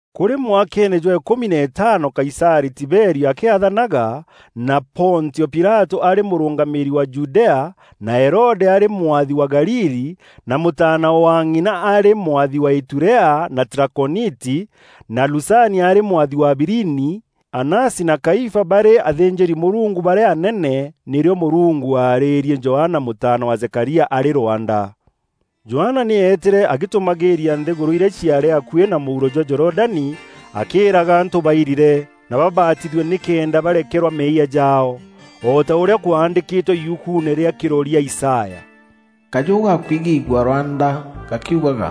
Kûrî mwakeene jwa îkûmi na îtaano Kaisarî Tiberio akîathanaga; na Pontio Pilatû aarî mûrûngamîîri wa Judea; na Herode aarî mwathi wa Galili; na mûtaana wa ng'ina arî mwathi wa Iturea na Trakoniti; na Lusania arî mwathi wa Abilini; Anasi na Kaifa barî athînjîri-Mûrungu barîa anene, nîrîo Mûrungu aarîrie Johana mûtaana wa Zekaria arî rwanda. Johana nî eetîre agîtûmagîîria nthîgûrû irîa ciaarî akuî na mûuro jwa Jorodani, akîîraga antû bairire na babatithue nîkenda barekerwa meeyia jaao. O ta ûrîa kwandîkîtwe yukuune rîa Kîroria Isaya; “Kajû gakwigîîgua rwanda gakiugaga: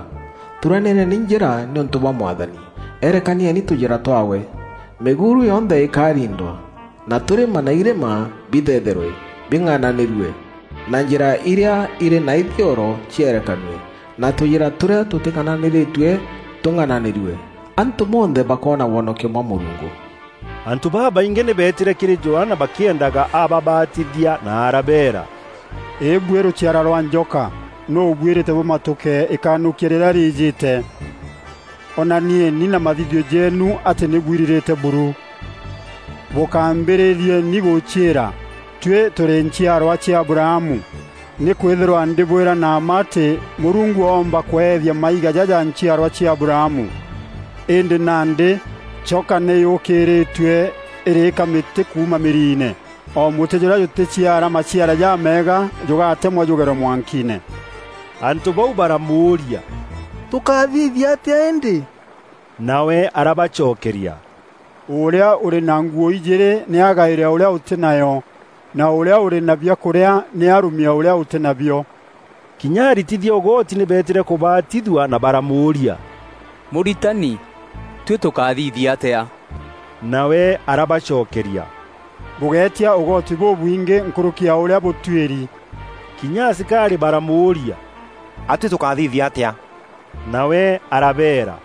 ‘Thuranîreni njîra nîûntû bwa Mwathani, erekanieni tûjîra twaawe. Mîguuru yonthe îkariindwa, na tûrîma na irîma bithetherwe bing'ananîrue, na njîra irîa irî na ithioro cierekanue, na tûjîra tûrîa tûtîng'ananîrîtie, tûng'ananîrue. Antû bonthe bakoona wonokio bwa Mûrungu.’” Antû babaingî nî beetîre kîrî Johana bakîendaga ababatithia na arabeera, “Îbuî rûciara rwa njoka! Nûû ûbwîrîte bûmatuke îkanûkia rîrîa rîîjîte? Onanieni na mathithio jeenu atî nî bwirirîte buru. Bûkambîrîrieni gûciîra, ‘Tuî tûrî nchiarwa cia Abrahamu.’ Nîkwîthîrwa ndîbwîra na mma atî Mûrungu oomba kweethia maiga jaja nchiarwa cia Abrahamu. Îndî nandî choka nî yûkîrîtue îrîka mîtî kuuma mîriine. O mûtî jûrîa jûtîciara maciara jameega jûgatemwa jûgerwe mwankiine.” Antû bau baramûûria, “Tûkathithia atîa îndî?” Nawe arabacokeria, “Ûrîa ûrî na nguû ijîîrî nî agaîre ûrîa ûtî nayo, na ûrîa ûrî na biakûrîa nî arûmie ûrîa ûtî nabio.” Kinya aritithia ûgoti nî beetîre kûbatithua na baramûûria, “Mûritani, tuî tûkathithia atîa?” Nawe arabacokeria, “Bûgéetia ûgoti bûbwingî nkûrûki ya ûrîa bûtuîri.” Kinya asikarî baramûûria, “A tuî tûkathithia atîa?” Nawe arabeera,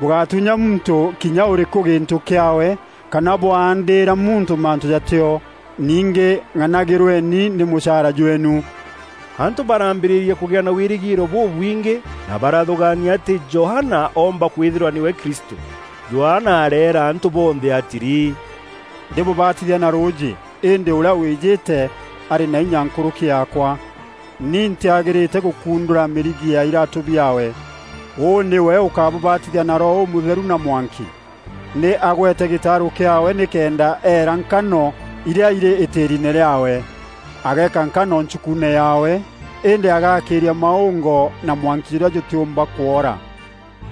“Bûgátuunya muntû kinya ûrîkû gîntû kîaawe kana bûandîîra muntû mantû jatîo. Ningî ng'anagîrweni nî mûchaara jweenu.” Antû barambîrîria kûgîa na wîrîgîîro bûbwingî na barathûgaania atî Johana oomba kwîthîrwa nîwe Kristû. Johana areera antû bonthe atîrî, “Ndîbûbatithia na rûûjî, îndî ûrîa wîjîte, arî na inya nkûrûki yaakwa. Ni ntîagîrîte gûkundûra mîrigi ya îratû biaawe. Ûû nîwe ûkabûbatithia na Roho Ûmûtheru na mwanki. Nî agwete gîtaarû kîaawe nîkenda eera nkano irîa irî îtîriine rîaawe. Ageeka nkano nchukuune yaawe, îndî agaakîîria maûngo na mwanki jûrîa jûtîûmba kwoora.”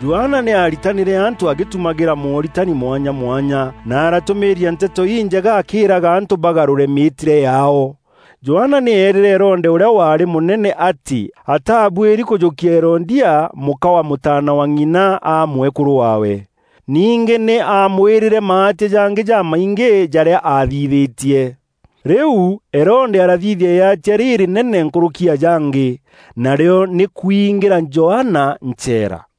Johana nî aaritanîre antû agîtumagîra mooritani mwanya mwanya na aratûmîîria Nteto Injega akîîraga antû bagarûre mîîtîre yaao. Johana nî eerîre Herode ûrîa waarî mûnene atî aatabuîri kûjûkia Herodia, mûka wa mûtaana wa ng'ina aa mwekûrû waawe. Ningî nî aamwîrîre maatia jangî jamaingî jarîa aathithîtie. Rîu Herode arathithia îatia rîrînene nkûrûki ya jangî, narîo nî kûingîra Johana ncheera.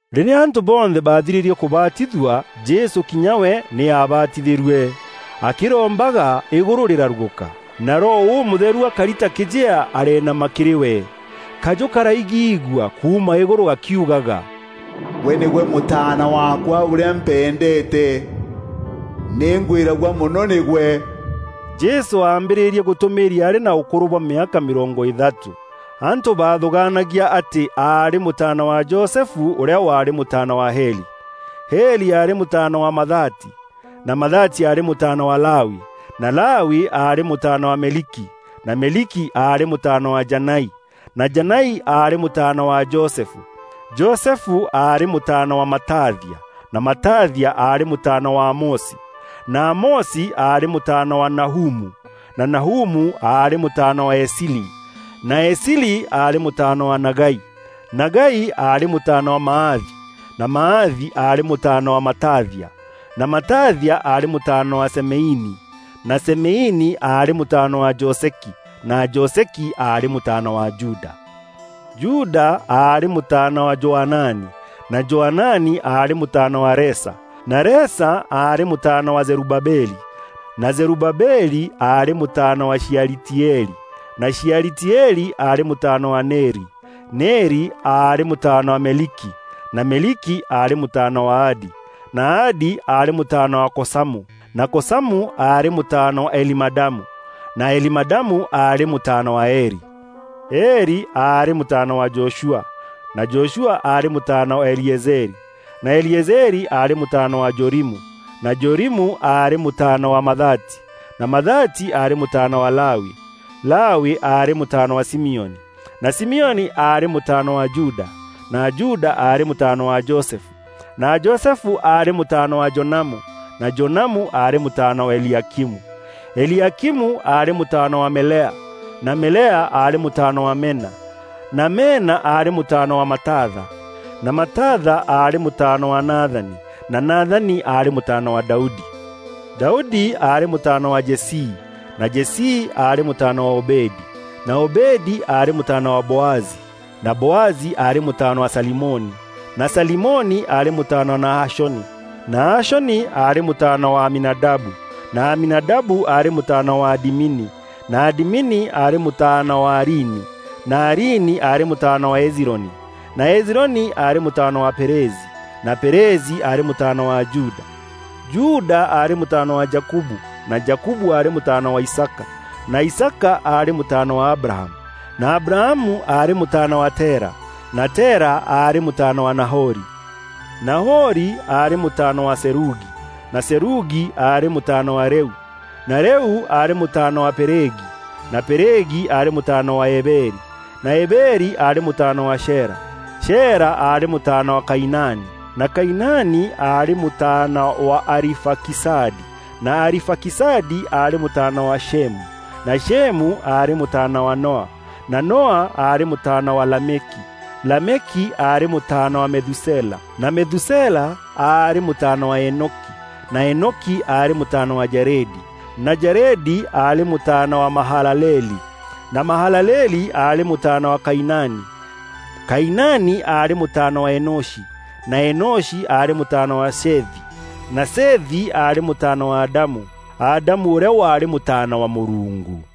Rîrîa antû bonthe baathirîrie kûbatithua, Jesû kinya we nî aabatithîrue. Akîrombaga, îgûrû rîrarugûka, na Roho Ûmûtheru akari ta kîjea areenama kîrî we. Kajû karaigîîgua kuuma îgûrû gakiugaga, “Gwe nîgwe Mûtaana waakwa ûrîa mpendeete. Nîngwîragua mono nîgwe.” Jesû aambîrîrie gûtûmîîria aarî na ûkûrû bwa mîaka mîrongo îthatû. Antû baathûgaanagia atî aarî mûtaana wa Josefu ûrîa waarî mûtaana wa Heli. Heli aarî mûtaana wa Mathati, na Mathati aarî mûtaana wa Lawi, na Lawi aarî mûtaana wa Meliki, na Meliki aarî mûtaana wa Janai, na Janai aarî mûtaana wa Josefu. Josefu aarî mûtaana wa Matathia, na Matathia aarî mûtaana wa Amosi, na Amosi aarî mûtaana wa Nahumu, na Nahumu aarî mûtaana wa Esili, na Esili aarî mûtaana wa Nagai. Nagai aarî mûtaana wa Maathi, na Maathi aarî mûtaana wa Matathia, na Matathia aarî mûtaana wa Semeini, na Semeini aarî mûtaana wa Joseki, na Joseki aarî mûtaana wa Juda. Juda aarî mûtaana wa Joanani, na Joanani aarî mûtaana wa Resa, na Resa aarî mûtaana wa Zerubabeli, na Zerubabeli aarî mûtaana wa Shealitieli na Shealitieli aarî mûtaana wa Neri. Neri aarî mûtaana wa Meliki, na Meliki aarî mûtaana wa Adi, na Adi aarî mûtaana wa Kosamu, na Kosamu aarî mûtaana wa Elimadamu, na Elimadamu aarî mûtaana wa Eri. Eri aarî mûtaana wa Joshua, na Joshua aarî mûtaana wa Eliezeri, na Eliezeri aarî mûtaana wa Jorimu, na Jorimu aarî mûtaana wa Mathati, na Mathati aarî mûtaana wa Lawi. Lawi aarî mûtaana wa Simioni, na Simioni aarî mûtaana wa Juda, na Juda aarî mûtaana wa Josefu, na Josefu aarî mûtaana wa Jonamu, na Jonamu aarî mûtaana wa Eliakimu. Eliakimu aarî mûtaana wa Melea, na Melea aarî mûtaana wa Mena, na Mena aarî mûtaana wa Matatha, na Matatha aarî mûtaana wa Nathani, na Nathani aarî mûtaana wa Daudi. Daudi aarî mûtaana wa Jesii, na Jesii aarî mûtaana wa Obedi, na Obedi aarî mûtaana wa Boazi, na Boazi aarî mûtaana wa Salimoni, na Salimoni aarî mûtaana wa Nahashoni. Nahashoni aarî mûtaana wa Aminadabu, na Aminadabu aarî mûtaana wa Adimini, na Adimini aarî mûtaana wa Arini, na Arini aarî mûtaana wa Hezironi, na Hezironi aarî mûtaana wa Perezi, na Perezi aarî mûtaana wa Juda. Juda aarî mûtaana wa Jakubu, na Jakubu aarî mûtaana wa Isaaka, na Isaaka aarî mûtaana wa Abrahamu, na Abrahamu aarî mûtaana wa Tera, na Tera aarî mûtaana wa Nahori. Nahori aarî mûtaana wa Serugi, na Serugi aarî mûtaana wa Reu, na Reu aarî mûtaana wa Pelegi, na Pelegi aarî mûtaana wa Eberi, na Eberi aarî mûtaana wa Shela. Shela aarî mûtaana wa Kainani, na Kainani aarî mûtaana wa Arifakisadi, na Arifakisadi aarî mûtaana wa Shemu, na Shemu aarî mûtaana wa Noa, na Noa aarî mûtaana wa Lameki. Lameki aarî mûtaana wa Methusela, na Methusela aarî mûtaana wa Enoki, na Enoki aarî mûtaana wa Jaredi, na Jaredi aarî mûtaana wa Mahalaleli, na Mahalaleli aarî mûtaana wa Kainani. Kainani aarî mûtaana wa Enoshi, na Enoshi aarî mûtaana wa Sethi, na Sethi aarî mûtaana wa Adamu. Adamu ûrîa waarî mûtaana wa Mûrungu.